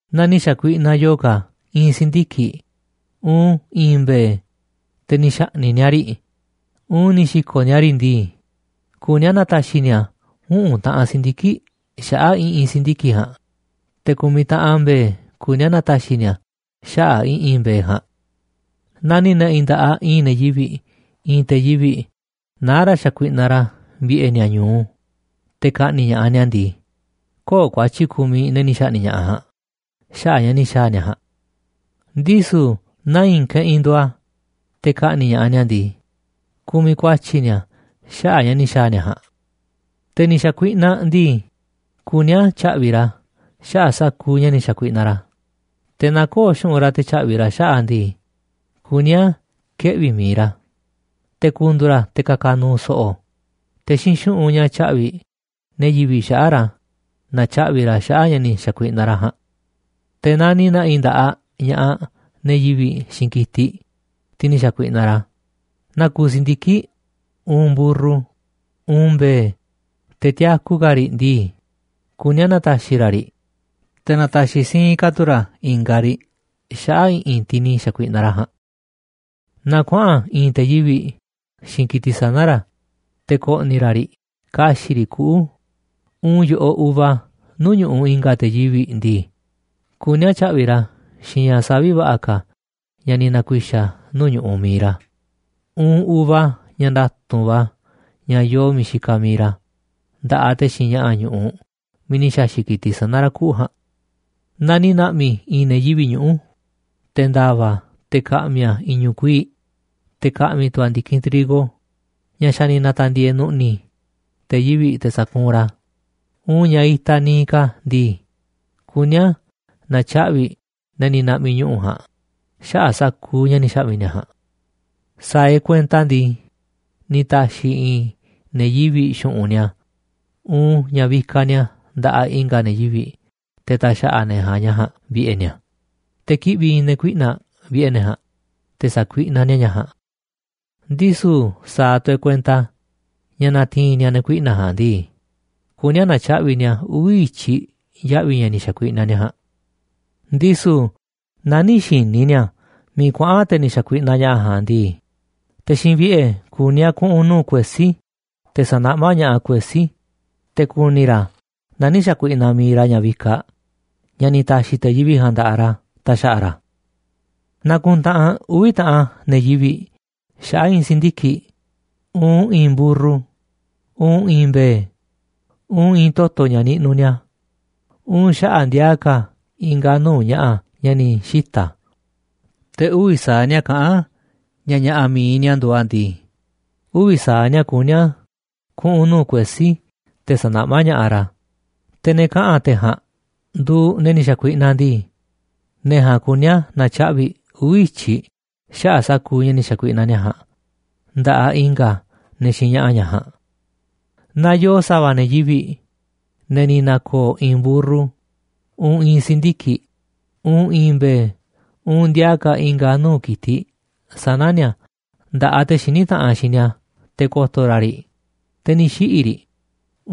’Naaꞌ ni̱ xa̱kuiꞌnaꞌ yo̱o̱ ka̱ i̱i̱n si̱ndiki̱ꞌ uun i̱i̱n mbe̱e̱, te̱ ni̱ xa̱ꞌni̱ꞌ ni̱a̱ riꞌ uun ni̱ xi̱ko̱ꞌ ni̱a̱ riꞌ ndii, kuní a̱ na̱ta̱xi̱ ni̱a̱ uꞌu̱n taꞌan si̱ndiki̱ꞌ xaꞌa̱ꞌ i̱ꞌi̱n si̱ndiki̱ꞌ ja̱a̱nꞌ, te̱ ku̱miꞌ taꞌan mbe̱e̱ kuní a̱ na̱ta̱xi̱ ni̱a̱ xaꞌa̱ꞌ i̱ꞌi̱n mbe̱e̱ ja̱a̱nꞌ. ’Naaꞌ ni̱ na̱ꞌi̱ nda̱ꞌaꞌ i̱i̱n ne̱ yivi̱ꞌ i̱i̱n te̱ yivi̱ꞌ naá ra̱ xakuiꞌnaꞌ ra̱ vi̱ꞌe̱ ni̱a̱ ñu̱u, te̱ ka̱ꞌni̱ꞌ ña̱ꞌaꞌ ni̱a̱ ndii, köo̱ꞌ ku̱a̱tyi̱ kumiꞌ ne̱ ni̱ xa̱ꞌni̱ꞌ ña̱ꞌaꞌ ja̱a̱nꞌ xaꞌa̱ꞌ ña̱ ni̱ xa̱a̱ ni̱a̱ ja̱a̱nꞌ. Ndisu̱ naaꞌ i̱i̱n keꞌinꞌ nduuꞌ a̱ te̱ ka̱ꞌni̱ꞌ ña̱ꞌaꞌ ni̱a̱ ndii, kumiꞌ ku̱a̱tyi̱ ni̱a̱ xaꞌa̱ꞌ ña̱ ni̱ xa̱a̱ ni̱a̱ ja̱a̱nꞌ. ’Te̱ ni̱ xa̱kuiꞌnaꞌ ndii, kuní a̱ tya̱ꞌvi̱ ra̱ xaꞌa̱ꞌ sa̱kuuꞌ ña̱ ni̱ xa̱kuiꞌnaꞌ ra̱, te̱ naaꞌ köo̱ꞌ xu̱ꞌunꞌ ra̱ te̱ tya̱ꞌvi̱ꞌ ra̱ xaꞌa̱ꞌ a̱ ndii, kuní a̱ keꞌvi̱ mi̱iꞌ ra̱ te̱ ku̱ndu̱u̱ ra̱ te̱ ka̱ka̱ nu̱u̱ so̱ꞌo̱, te̱ xiinꞌ xu̱ꞌunꞌ ña̱ tya̱ꞌvi̱ꞌ ne̱ yivi̱ꞌ xaꞌa̱ꞌ ra̱ na̱tyaꞌvi̱ ra̱ xaꞌa̱ꞌ ña̱ ni̱ xa̱kuiꞌnaꞌ ra̱ ja̱a̱nꞌ. Te̱ naaꞌ ni̱ na̱ꞌi̱ nda̱ꞌaꞌ ña̱ꞌaꞌ ne̱ yivi̱ꞌ xiinꞌ ki̱tiꞌ, tiꞌ ni̱ xa̱kuiꞌnaꞌ ra̱, naa kuuꞌ si̱ndiki̱ꞌ, uun mburru, uun mbe̱e̱, te̱ tiaku ka̱ riꞌ ndii, kuní a̱ na̱ta̱xi̱ ra̱ riꞌ, te̱ na̱ta̱xi̱ siinꞌ ka̱ tu̱ ra̱ i̱nga̱ riꞌ xaꞌa̱ꞌ i̱ꞌi̱n tiꞌ ni̱ xa̱kuiꞌnaꞌ ra̱ ja̱a̱nꞌ. ’Naaꞌ kuaꞌa̱n i̱i̱n te̱ yivi̱ꞌ xiinꞌ ki̱tiꞌ sana̱ ra̱ te̱ ko̱ꞌni̱ ra̱ riꞌ ka̱xi̱ꞌ riꞌ kuꞌu̱ uun yo̱ꞌoꞌ uva nuu̱ꞌ ñu̱ꞌuꞌ i̱nga̱ te̱ yivi̱ꞌ ndii, kuní a̱ tya̱ꞌvi̱ꞌ ra̱ xiinꞌ ña̱ savi̱ꞌ va̱ꞌa̱ ka̱ ña̱ ni̱ na̱ku̱i̱xa̱ nuu̱ꞌ ñu̱ꞌuꞌ mi̱iꞌ ra̱ uun uva ña̱ nda̱tu̱nꞌ va̱ ña̱ yoo miiꞌ xikaꞌ mi̱iꞌ ra̱ nda̱ꞌaꞌ te̱ xiinꞌ ña̱ꞌa̱ ñu̱ꞌuꞌ miiꞌ ni̱ xa̱xi̱ꞌ ki̱tiꞌ sana̱ ra̱ kuꞌu̱ ja̱a̱nꞌ. ’Naaꞌ ni̱ na̱ꞌmi̱ i̱i̱n ne̱ yivi̱ꞌ ñuꞌu̱, te̱ nda̱va̱ a̱ te̱ ka̱ꞌmi̱ a̱ i̱ñu̱ꞌ kuii̱ꞌ, te̱ ka̱ꞌmi̱ tu̱ a̱ ndi̱kinꞌ trigo ña̱ xa̱ ni̱ na̱ta̱ndi̱e̱e̱ nu̱ꞌni̱ te̱ yivi̱ꞌ te̱ sa̱kuunꞌ ra̱ a̱ uun ña̱ itaꞌ niiꞌ ka̱ ndii, kuní a̱ na̱tyaꞌvi̱ ne̱ ni̱ na̱ꞌmi̱ ñuꞌu̱ ja̱a̱nꞌ xaꞌa̱ꞌ sa̱kuuꞌ ña̱ ni̱ xa̱ꞌmi̱ ni̱a̱ ja̱a̱nꞌ. ’Sa̱a̱ e̱ꞌ kuenta ndii, ni̱ ta̱xi̱ i̱i̱n ne̱ yivi̱ꞌ xu̱ꞌunꞌ ni̱a̱ uun ña̱ vikaꞌ ni̱a̱ nda̱ꞌaꞌ i̱nga̱ ne̱ yivi̱ꞌ te̱ ta̱xa̱ꞌa̱ ne̱ ja̱a̱nꞌ ña̱ ja̱a̱nꞌ vi̱ꞌe̱ ni̱a̱, te̱ kiꞌvi̱ i̱i̱n ne̱ kuiꞌnaꞌ vi̱ꞌe̱ ne̱ ja̱a̱nꞌ te̱ sa̱kuiꞌna ni̱a̱ ña̱ꞌ ja̱a̱nꞌ. Ndisu̱ sa̱a̱ tu̱ e̱ꞌ kuenta ña̱ na̱ti̱i̱n ni̱a̱ ne̱ kuiꞌna̱ꞌ ja̱a̱nꞌ ndii, kuní a̱ na̱tyaꞌvi̱ ni̱a̱ uvi̱ i̱tyiꞌ ya̱ꞌvi̱ ña̱ ni̱ xa̱kuiꞌnaꞌ ni̱a̱ ja̱a̱nꞌ. Ndisu̱ naaꞌ nï̱ xi̱ni̱ ni̱a̱ miiꞌ kuaꞌa̱n te̱ ni̱ xakuiꞌnaꞌ ña̱ꞌa̱ ja̱a̱nꞌ ndii, te̱ xiinꞌ vi̱ꞌe̱ kuní a̱ kuꞌu̱n nuu̱ꞌ kuesí te̱ sa̱naꞌmá ña̱ꞌaꞌ kuesí te̱ ku̱ni̱ ra̱ naaꞌ nï̱ xa̱kuiꞌnaꞌ mi̱iꞌ ra̱ ña̱ vikaꞌ ña̱ ni̱ ta̱xi̱ te̱ yivi̱ꞌ ja̱a̱nꞌ nda̱ꞌaꞌ ra̱ ta̱xa̱ꞌa̱ ra̱. ’Naaꞌ kuntaꞌanꞌ uvi̱ taꞌan ne̱ yivi̱ꞌ xaꞌa̱ꞌ i̱i̱n si̱ndiki̱ꞌ, uun i̱i̱n mburru, uun i̱i̱n mbe̱e̱, uun i̱i̱n toto̱ ña̱ niꞌnuꞌ ni̱a̱, uun xaꞌa̱ꞌ ndiaa ka̱ i̱nga̱ nuu̱ꞌ ña̱ꞌa̱ ña̱ ni̱ xita̱, te̱ uvi̱ sa̱aꞌ ni̱a̱ kaꞌán ña̱ ña̱ꞌa̱ mi̱iꞌ ni̱a̱ nduuꞌ a̱ ndii, uvi̱ sa̱aꞌ ni̱a̱ kuní a̱ kuꞌu̱n nuu̱ꞌ kuesí te̱ sa̱naꞌmá ña̱ꞌaꞌ ra̱, te̱ ne̱ kaꞌa̱n te̱ ja̱a̱nꞌ nduuꞌ ne̱ ni̱ xa̱kuiꞌnaꞌ ndii, ne̱ ja̱a̱nꞌ kuní a̱ na̱tyaꞌvi̱ uvi̱ i̱tyiꞌ xaꞌa̱ꞌ sa̱kuuꞌ ña̱ ni̱ xa̱kuiꞌnaꞌ ni̱a̱ ja̱a̱nꞌ nda̱ꞌaꞌ i̱nga̱ ne̱ xiinꞌ ña̱ꞌa̱ ña̱ ja̱a̱nꞌ. ’Naaꞌ yoo sa̱va̱ ne̱ yivi̱ꞌ, ne̱ ni̱ na̱ko̱o̱ i̱i̱n mburru, uun i̱i̱n si̱ndiki̱ꞌ, uun i̱i̱n mbe̱e̱, uun ndiaaꞌ ka̱ i̱nga̱ nuu̱ꞌ ki̱tiꞌ sana̱ ni̱a̱ nda̱ꞌaꞌ te̱ xiní taꞌanꞌ xiinꞌ ni̱a̱ te̱ ko̱to̱ ra̱ riꞌ, te̱ ni̱ xiꞌi̱ riꞌ,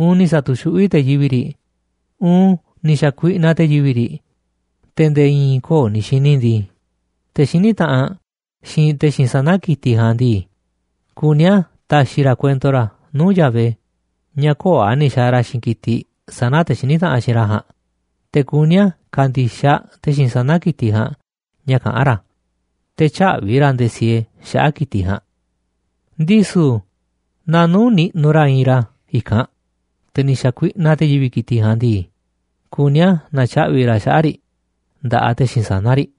uun te̱ ni̱ sa̱tu̱xuꞌví te̱ yivi̱ꞌ riꞌ, uun ni̱ xa̱kuiꞌnaꞌ te̱ yivi̱ꞌ riꞌ, te̱ nde̱e̱ i̱i̱n köo̱ꞌ ni̱ xi̱ni̱ ndii, te̱ xiní taꞌanꞌ xiinꞌ te̱ xiinꞌ sana̱ ki̱tiꞌ ja̱a̱nꞌ ndii, kuní a̱ ta̱xi̱ ra̱ kuento ra̱ nuu̱ꞌ Yahvé ña̱ köo̱ꞌ a̱ ni̱ xa̱a̱ ra̱ xiinꞌ ki̱tiꞌ sana̱ te̱ xiní taꞌanꞌ xiinꞌ ra̱ ja̱a̱nꞌ, te̱ kuní a̱ ka̱ndi̱xaꞌ te̱ xiinꞌ sana̱ ki̱tiꞌ ja̱a̱nꞌ ña̱ kaꞌán ra̱, te̱ tyä̱ꞌvi̱ ra̱ nde̱e̱ siee xaꞌa̱ꞌ ki̱tiꞌ ja̱a̱nꞌ. Ndisu̱ naaꞌ nuu̱ꞌ niꞌnuꞌ ra̱ iinꞌ ra̱ i̱kanꞌ, te̱ ni̱ xa̱kuiꞌnaꞌ te̱ yivi̱ꞌ ki̱tiꞌ ja̱a̱nꞌ ndii, kuní a̱ na̱tyaꞌvi̱ ra̱ xaꞌa̱ꞌ riꞌ nda̱ꞌaꞌ te̱ xiinꞌ sana̱ riꞌ.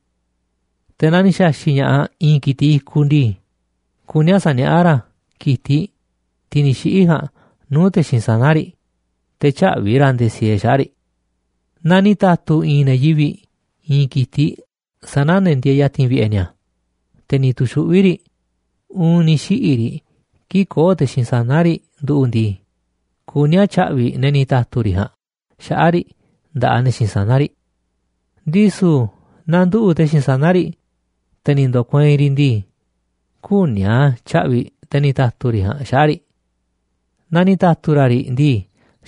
Te̱ naaꞌ ni̱ xa̱xi̱ꞌ ña̱ꞌaꞌ i̱i̱n ki̱tiꞌ i̱kuꞌ ndii, kuní a̱ sa̱niaꞌá ra̱ ki̱tiꞌ, tiꞌ ni̱ xiꞌi̱ ja̱a̱nꞌ, nuu̱ꞌ te̱ xiinꞌ sana̱ riꞌ, te̱ tyä̱ꞌvi̱ ra̱ nde̱e̱ siee xaꞌa̱ꞌ riꞌ. ’Naaꞌ ni̱ ta̱tu̱ i̱i̱n ne̱ yivi̱ꞌ i̱i̱n ki̱tiꞌ sana̱ ne̱ ndieeꞌ ya̱ti̱n vi̱ꞌe̱ ni̱a̱, te̱ ni̱ tu̱xuꞌví riꞌ uun ni̱ xiꞌi̱ riꞌ kii̱ꞌ köo̱ꞌ te̱ xiinꞌ sana̱ riꞌ nduꞌu̱ꞌ ndii, kuní a̱ tya̱ꞌvi̱ ne̱ ni̱ ta̱tu̱ riꞌ ja̱a̱nꞌ xaꞌa̱ꞌ riꞌ nda̱ꞌaꞌ ne̱ xiinꞌ sana̱ riꞌ. Ndisu̱ naaꞌ nduꞌu̱ꞌ te̱ xiinꞌ sana̱ riꞌ te̱ ni̱ ndo̱kueinꞌ riꞌ ndii, küní a̱ tya̱ꞌvi̱ꞌ te̱ ni̱ ta̱tu̱ riꞌ ja̱a̱nꞌ xaꞌa̱ꞌ riꞌ. Naa ni̱ ta̱tu̱ ra̱ riꞌ ndii,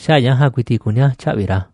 xaꞌa̱ꞌ ña̱ ja̱a̱nꞌ ku̱i̱ti̱ꞌ kuní a̱ tya̱ꞌvi̱ ra̱.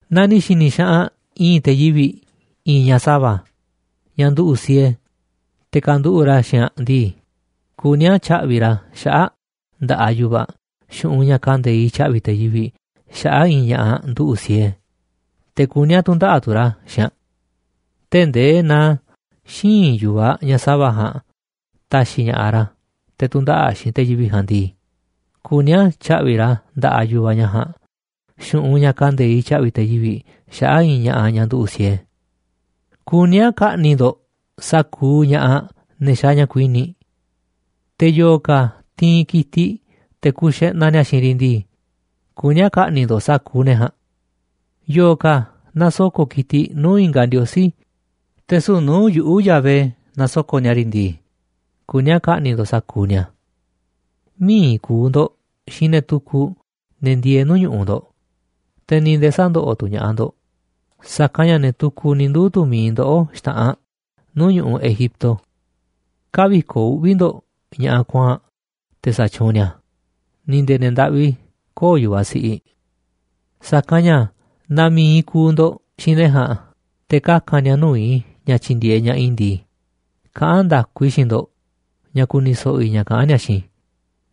’Naaꞌ ni̱ xi̱ni̱ xaꞌanꞌ i̱i̱n te̱ yivi̱ꞌ i̱i̱n ñaꞌ sa̱va̱, ñaꞌ nduꞌu̱ꞌ siee, te̱ ka̱nduꞌu̱ꞌ ra̱ xiinꞌ aꞌ ndii, kuní a̱ tya̱ꞌvi̱ꞌ ra̱ xaꞌa̱ꞌ aꞌ nda̱ꞌaꞌ yu̱vaꞌ aꞌ xu̱ꞌunꞌ ña̱ kande̱iꞌ tya̱ꞌvi̱ te̱ yivi̱ꞌ xaꞌa̱ꞌ i̱i̱n ña̱ꞌaꞌ nduꞌu̱ꞌ siee, te̱ kuní a̱ tu̱ndaꞌa̱ꞌ tu̱ ra̱ xiinꞌ aꞌ. Tee̱ꞌ ndee naaꞌ xïinꞌ yu̱vaꞌ ñaꞌ sa̱va̱ ja̱a̱nꞌ ta̱xi̱ ña̱ꞌaꞌ ra̱ te̱ tu̱ndaꞌa̱ꞌ xiinꞌ te̱ yivi̱ꞌ ja̱a̱nꞌ ndii, kuní a̱ tya̱ꞌvi̱ꞌ ra̱ nda̱ꞌaꞌ yu̱vaꞌ ñaꞌ ja̱a̱nꞌ xu̱ꞌunꞌ ña̱ kande̱iꞌ tya̱ꞌvi̱ te̱ yivi̱ꞌ xaꞌa̱ꞌ i̱i̱n ña̱ꞌaꞌ ñaꞌ nduꞌu̱ꞌ siee. ’Kuní a̱ ka̱ꞌni̱ꞌ ndo̱ꞌ sa̱kuuꞌ ña̱ꞌaꞌ ne̱ xaaꞌ ña̱ kuini̱ꞌ. ’Te̱ yo̱o̱ ka̱ ti̱i̱n ki̱tiꞌ te̱ ku̱u̱ xeꞌnaꞌ ni̱a̱ xiinꞌ riꞌ ndii, kuní a̱ ka̱ꞌni̱ꞌ ndo̱ꞌ sa̱kuuꞌ ne̱ ja̱a̱nꞌ. ’Yo̱o̱ ka̱ nasoko̱ꞌ ki̱tiꞌ nuu̱ꞌ i̱nga̱ ndiosí, te̱ süu̱ꞌ nuu̱ꞌ yuꞌu̱ Yahvé nasoko̱ꞌ ni̱a̱ riꞌ ndii, kuní a̱ ka̱ꞌni̱ꞌ ndo̱ꞌ sa̱kuuꞌ ni̱a̱. ’Mï̱iꞌ ku̱u̱ ndo̱ꞌ xiinꞌ ne̱ tukuꞌ, ne̱ ndieeꞌ nu̱uꞌ ñu̱ꞌuꞌ ndo̱ꞌ, te̱ ni̱ nde̱e̱ sä̱ndoꞌoꞌ tu̱ ña̱ꞌaꞌ ndo̱ꞌ, sa̱kanꞌ ña̱ ne̱ tukuꞌ ni̱ nduu̱ tu̱ mi̱iꞌ ndoꞌó xta̱ꞌanꞌ nuu̱ꞌ ñu̱ꞌuꞌ Egipto. ’Kä̱vi̱koꞌ uꞌvi̱ ndo̱ꞌ ña̱ꞌaꞌ kuaa̱nꞌ te̱ sa̱tyuunꞌ ni̱a̱, ni̱ nde̱e̱ ne̱ ndaꞌvi köo̱ꞌ yu̱vaꞌ siꞌiꞌ. Sa̱kanꞌ ña̱ naaꞌ mi̱iꞌ kuuꞌ ndo̱ꞌ xiinꞌ ne̱ ja̱a̱nꞌ te̱ kaka̱n ni̱a̱ nuu̱ꞌ i̱ ña̱ tyi̱ndi̱e̱eꞌ ña̱ꞌaꞌ i̱ ndii, kaꞌán nda̱ku i̱ xiinꞌ ndo̱ꞌ ña̱ ku̱ni̱ so̱ꞌo̱ i̱ ña̱ kaꞌán ni̱a̱ xiinꞌ i̱,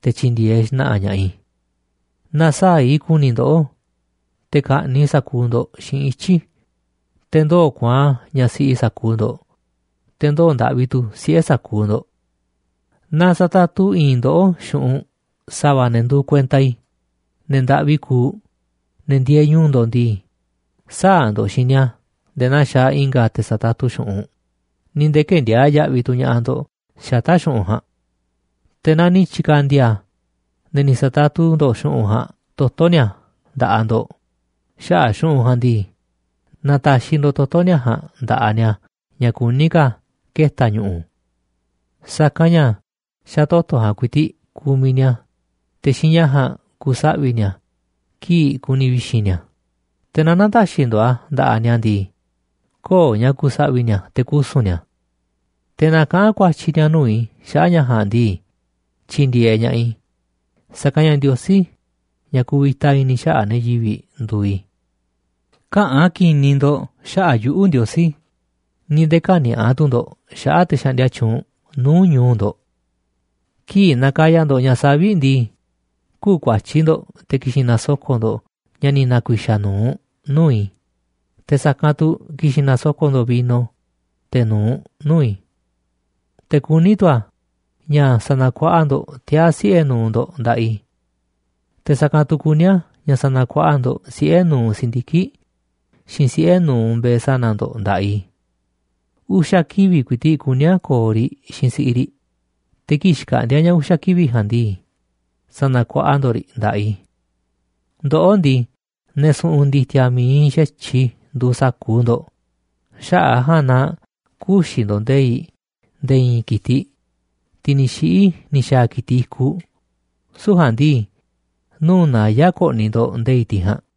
te̱ tyi̱ndi̱e̱eꞌ xna̱ꞌa̱ ña̱ꞌaꞌ i̱. Na̱saa̱ꞌ i̱ ku̱ni̱ i̱ ndoꞌó, te̱ ka̱ꞌni̱ꞌ i̱ sa̱kuuꞌ ndo̱ꞌ xiinꞌ ityi̱ i̱, te̱ ndoo̱ kuaa̱nꞌ ñaꞌ siꞌi sa̱kuuꞌ ndo̱ꞌ, te̱ ndoo̱ ndaꞌvi tu̱ siꞌe̱ sa̱kuuꞌ ndo̱ꞌ. ’Naaꞌ sa̱tatu i̱i̱n ndoꞌó xu̱ꞌunꞌ sa̱va̱ ne̱ nduuꞌ kuenta i̱, ne̱ ndaꞌvi kuuꞌ, ne̱ ndieeꞌ ñu̱u̱ ndo̱ꞌ ndii, sä̱a̱ ndo̱ꞌ xiinꞌ ni̱a̱ nde̱e̱ naa xaaꞌ i̱nga̱ te̱ satatu xu̱ꞌunꞌ, ni̱ nde̱e̱ kë̱ndiaa̱ꞌ yaꞌviꞌ tu̱ ña̱ꞌaꞌ ndo̱ꞌ xata̱ꞌ xu̱ꞌunꞌ ja̱a̱nꞌ. Te̱ naaꞌ ni̱ tyi̱ka̱ndi̱a̱ ne̱ ni̱ sa̱tatu ndo̱ꞌ xu̱ꞌunꞌ ja̱a̱nꞌ toto̱ ni̱a̱ nda̱ꞌaꞌ ndo̱ꞌ xaꞌa̱ꞌ xu̱ꞌunꞌ ja̱a̱nꞌ ndii, na̱ta̱xi̱ ndo̱ꞌ toto̱ ni̱a̱ ja̱a̱nꞌ nda̱ꞌaꞌ ni̱a̱ ña̱ kuní ka̱ keta̱ ñu̱ꞌu̱. Sa̱kanꞌ ña̱ xa̱ toto̱ ja̱a̱nꞌ ku̱i̱ti̱ꞌ kumiꞌ ni̱a̱, te̱ xiinꞌ ña̱ ja̱a̱nꞌ ku̱saꞌvi̱ ni̱a̱ kii̱ꞌ ku̱ni̱ vi̱xi̱n ni̱a̱, te̱ naaꞌ nä̱ta̱xi̱ ndo̱ꞌ a̱ nda̱ꞌaꞌ ni̱a̱ ndii, köo̱ꞌ ña̱ ku̱saꞌvi̱ ni̱a̱ te̱ kusu̱n ni̱a̱. Te̱ naaꞌ kaꞌa̱n ku̱a̱tyi̱ ni̱a̱ nuu̱ꞌ i̱ xaꞌa̱ꞌ ña̱ ja̱a̱nꞌ ndii, tyi̱ndi̱e̱eꞌ ña̱ꞌaꞌ i̱, sa̱kanꞌ ña̱ Ndiosí, ña̱ kuvita i̱ni̱ xaꞌa̱ꞌ ne̱ yivi̱ꞌ, nduuꞌ i̱. ’Käꞌa̱n ki̱ni̱ ndo̱ꞌ xaꞌa̱ꞌ yuꞌu̱, Ndiosí, ni̱ nde̱e̱ kä̱ni̱a̱ꞌa tu̱ ndo̱ꞌ xaꞌa̱ꞌ te̱ xaꞌndia tyuunꞌ nuu̱ꞌ ñu̱u̱ ndo̱ꞌ. ’Kii̱ꞌ nakaya ndo̱ꞌ ña̱ savi̱ꞌ ndii, kü̱u̱ kuatyí ndo̱ꞌ te̱ ki̱xi̱n na̱soko̱ꞌ ndo̱ꞌ ña̱ ni̱ na̱ku̱i̱xa̱ nu̱uꞌ nuu̱ꞌ i̱, te̱ sa̱kanꞌ tu̱ ki̱xi̱n na̱soko̱ꞌ ndo̱ꞌ vino, teꞌ nu̱uꞌ nuu̱ꞌ i̱. ’Te̱ kuní tu̱ a̱ ña̱ sa̱na̱kuaꞌa ndo̱ꞌ tiaa̱ siꞌe̱ nu̱uꞌ ndo̱ꞌ nda̱ꞌaꞌ i̱. Te̱ sa̱kanꞌ tu̱ kuní a̱ ña̱ sa̱na̱kuaꞌa ndo̱ꞌ siꞌe̱ nu̱uꞌ si̱ndiki̱ꞌ, xiinꞌ siꞌe̱ nu̱uꞌ mbe̱e̱ sana̱ ndo̱ꞌ nda̱ꞌaꞌ i̱. Uxa̱ kivi̱ꞌ ku̱i̱ti̱ꞌ kuní a̱ ko̱o̱ riꞌ xiinꞌ si̱ꞌiꞌ riꞌ, te̱ kii̱ꞌ xkaꞌndi̱a̱ ña̱ uxa̱ kivi̱ꞌ ja̱a̱nꞌ ndii, sa̱na̱kuaꞌa ndo̱ꞌ riꞌ nda̱ꞌaꞌ i̱. ’Ndoꞌó ndii, ne̱ su̱ꞌu̱n ndi̱ti̱a̱ mi̱iꞌ xa̱tyiꞌ i̱ nduuꞌ sa̱kuuꞌ ndo̱ꞌ. Xaꞌa̱ꞌ a̱ ja̱a̱nꞌ na kü̱xi̱ ndo̱ꞌ nde̱i̱ꞌ nde̱e̱ i̱i̱n ki̱tiꞌ, tiꞌ ni̱ xiꞌi̱ ni̱ xa̱a̱ ki̱tiꞌ i̱kuꞌ, süu̱ꞌ ja̱a̱nꞌ ndii nuu̱ꞌ naya̱ꞌ ko̱ꞌni̱ ndo̱ꞌ nde̱i̱ꞌ tiꞌ ja̱a̱nꞌ.